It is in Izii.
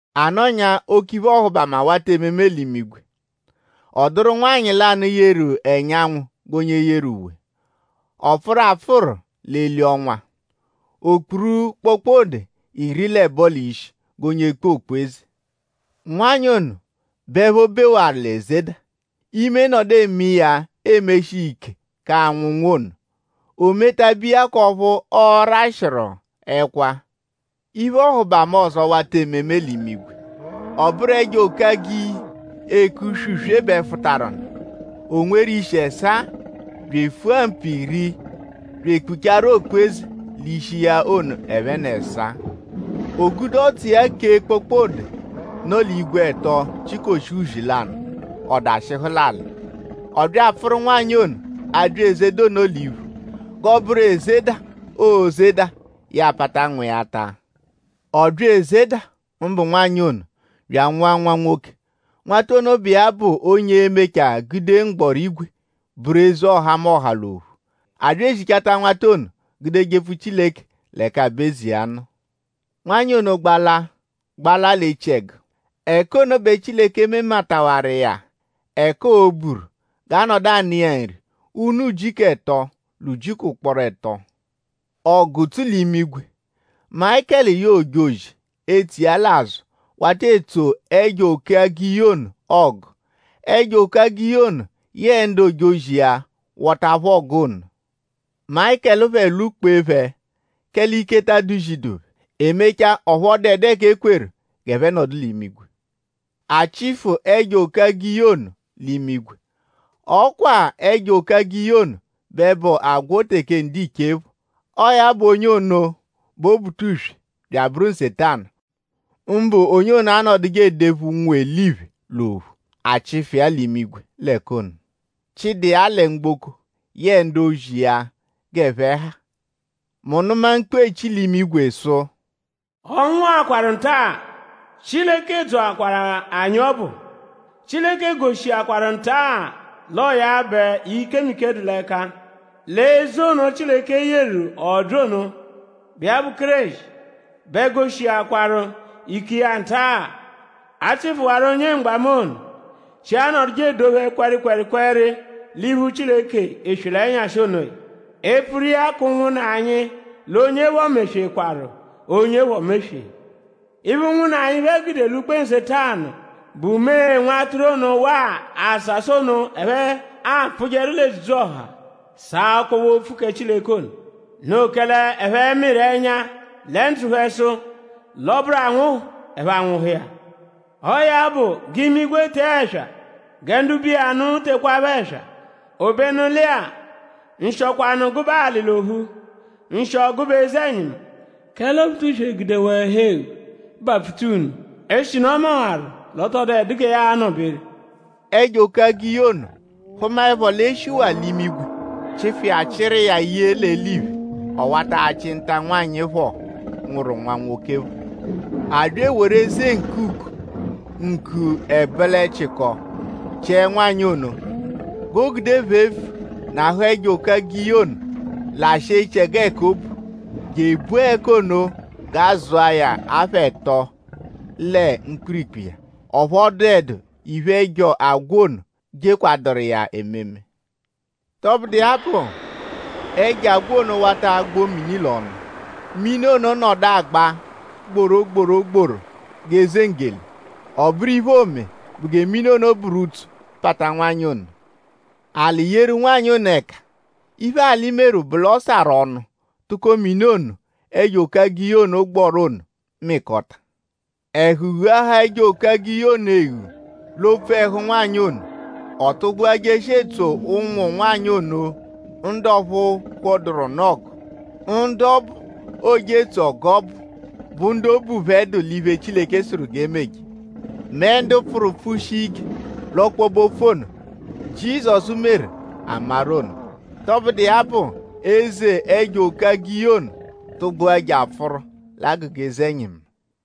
A nọnyaa; oke iphe-ọhubama wata ememe l'imigwe. Ọ dụru nwanyị lanụ, yeru ẹnyanwu g'onye yeru uwe. Ọ pfụru apfụru l'eli ọnwa. O kpuru kpokpode iri l'ẹbo l'ishi g'onye kpu okpu-eze. Nwanyị ono bẹ ẹpho bewaru l'ezeda. Ime nọdu eme iya emeshi iya ike k'anwụ nwa ono. O metabe iya k'ọphu ọ rashịaru ẹkwa. Iphe-ọhubama ọzo wata ememe l'imigwe. Ọ bụru ẹjo-oke-agiyi, eke uswe-uswe bẹ fụtaru nụ. O nweru ishi ẹsaa; bya efua mpu iri bya ekpuchaaru okpu-eze l'ishi iya ono ẹphe n'ẹsaa. O gude ọdzu iya kèé kpokpode, nọ l'igwe ẹto chikoshia uzi lanụ; ọ dashịhu l'alị. Ọ bya apfụru nwanyị ono, abya ezeda ono l'iphu; g'ọo-bụru: ezeda, oozeda; ya apata nwa iya taa. Ọ bya ezeda; mbụ nwanyị ono; bya anwụa nwa nwoke. Nwata ono bụ iya bụ onye e-mechaa gude mgbọrígwè bụru eze ọhamoha l'ophu. A bya ezichata nwata ono gude jepfu Chileke l'ẹka aba-eze iya nọ. Nwanyị ono gbala gbaba l'echiẹgu. Ẹka ono bẹ Chileke mematawaru iya ẹka oo-buru g'a nọdu anụ iya nri ụnu ujiku ẹto l'ujiku ụkporo ẹto. Ọgu tsu l'imigwe! Mayịkelu yẹe ojozi, etso iya l'azụ wata etso ẹjo-oke-agiyi ono ọgu. Ẹjo-oke-agiyi ono yẹe ndu ojozi iya wọta phẹ ọgu ono. Mayịkelu phẹ lwụ-kpee phẹ; kẹle ike ta adụ-zidu phẹ. E mechaa; ọphu ọ dụedu ẹka e kweru g'ẹphe nọdu l'imigwe. A chịfu ẹjo-oke-agiyi ono l'imigwe. Ọ kwa-a ẹjo-oke-agiyi ono bẹ bụ agwọ teke ndiche phọ. Ọo ya bụ onye ono bụ Obutuswe bya abụru Nsetanu; mbụ onye anọduje edephu ụnwu-eliphe l'ophu. A chịfu iya l'imigwe l'ẹka ono; chịdata iya lẹ mgboko yẹe ndu ojozi iya g'ẹphe ha. Mu nụma mkpu, eechi l'imigwe sụ: “Ọ nwụakwaru nta-a. Chileke dzọakwaru anyi ọbu. Chileke goshiakwaru nta-a l'ọo ya bẹ ikemike dụ l'ẹka. L'eze ono, Chileke yeru ọ bya ono, bụ iya bụ Kéreshi bẹ goshiakwaru ike iya nta. A chịfuwaru onye mgbamu ono, shi anọduje edophe kwẹrikwerikweri l'iphu Chileke eswe l'ẹnyashi onoya; epfuru iya k'ụnwunna anyi; l'onye phọ meswekwaru; onye phọ meswee. Iphe, ụnwunna anyi phẹ gude lwụ-kpee Nsetanu bụ mee Nwatụru ono waa àsàsà ono, ẹphe apfụjeru l'edzudzu-ọha sàá ọkpobe-opfu kẹ Chileke ono. Noo kẹle ẹphe mịru ẹnya lẹ ndzụ phẹ sụ: l'ọ -bụru anwụhu; ẹphe anwụhu iya. Ọo ya bụ; g'imigwe tee ẹswa; gẹ ndu bu iya nụ tekwaaphọ ẹswa. Obenu lẹ-a; nshịokwanu gụbe alị l'ophu; nshịo gụbe eze-ẹnyimu; kẹle Obutuswe gudewaa ẹhu-eghu bapfuta unu; eshinu ọ mawaru l'ọ tọ dụedu gẹ ya anọ-beru.” Ẹjo-oke-agiyi ono hụmaepho l'e shiwaa l'imigwe chịfu iya chịru iya ye l'eliphe; ọ wata achị nta nwanyị phọ, nwụru nwa nwoke phọ. A bya eworu eze ǹkù ugo; ǹkù ẹbolechiko chiẹ nwanyị ono g'o gude phefu nahụ ẹjo-oke-agiyi ono lashịa echiẹgu ẹka o bu; je ebua ẹka ono g'a zụa ya apha ẹto lẹ mkpirikpu iya. Ọphu ọ dụedu iphe, ẹjo agwọ ono jekwaduru iya ememe. Tọbudu iya bụ; ẹjo agwọ ono wata agbọ mini l'ọnu; mini ono nọdu agba gborogborogboro g'eze nggele. Ọ bụru iphe, oome bụ gẹ mini ono bụru utso pata nwanyị ono. Alị yeru nwanyị ono ẹka. Iphe, alị meru bụ l'ọ sarụ ọnu tụko mini ono, ẹjo-oke-agiyi ono gbọru ono mịkota. Ẹhu ghuahaa ẹjo-oke-agiyi ono eghu l'opfu ẹhu nwanyị ono. Ọ tụgbua jeshia etso ụnwu nwanyị ono ndu ọphu phọduru nụ ọgu. Ndu ọbu, ooje etso ọgu ọbu bụ ndu obu phẹ dụ l'iphe, Chileke sụru g'e meje; mẹ ndu pfụru pfụshia ike l'ọkpobe-opfu ono, Jizọsu meru a maru ono. Tọbudu iya bụ; eze ẹjo-oke-agiyi ono tụgbua je apfụru l'agụga eze-ẹnyimu.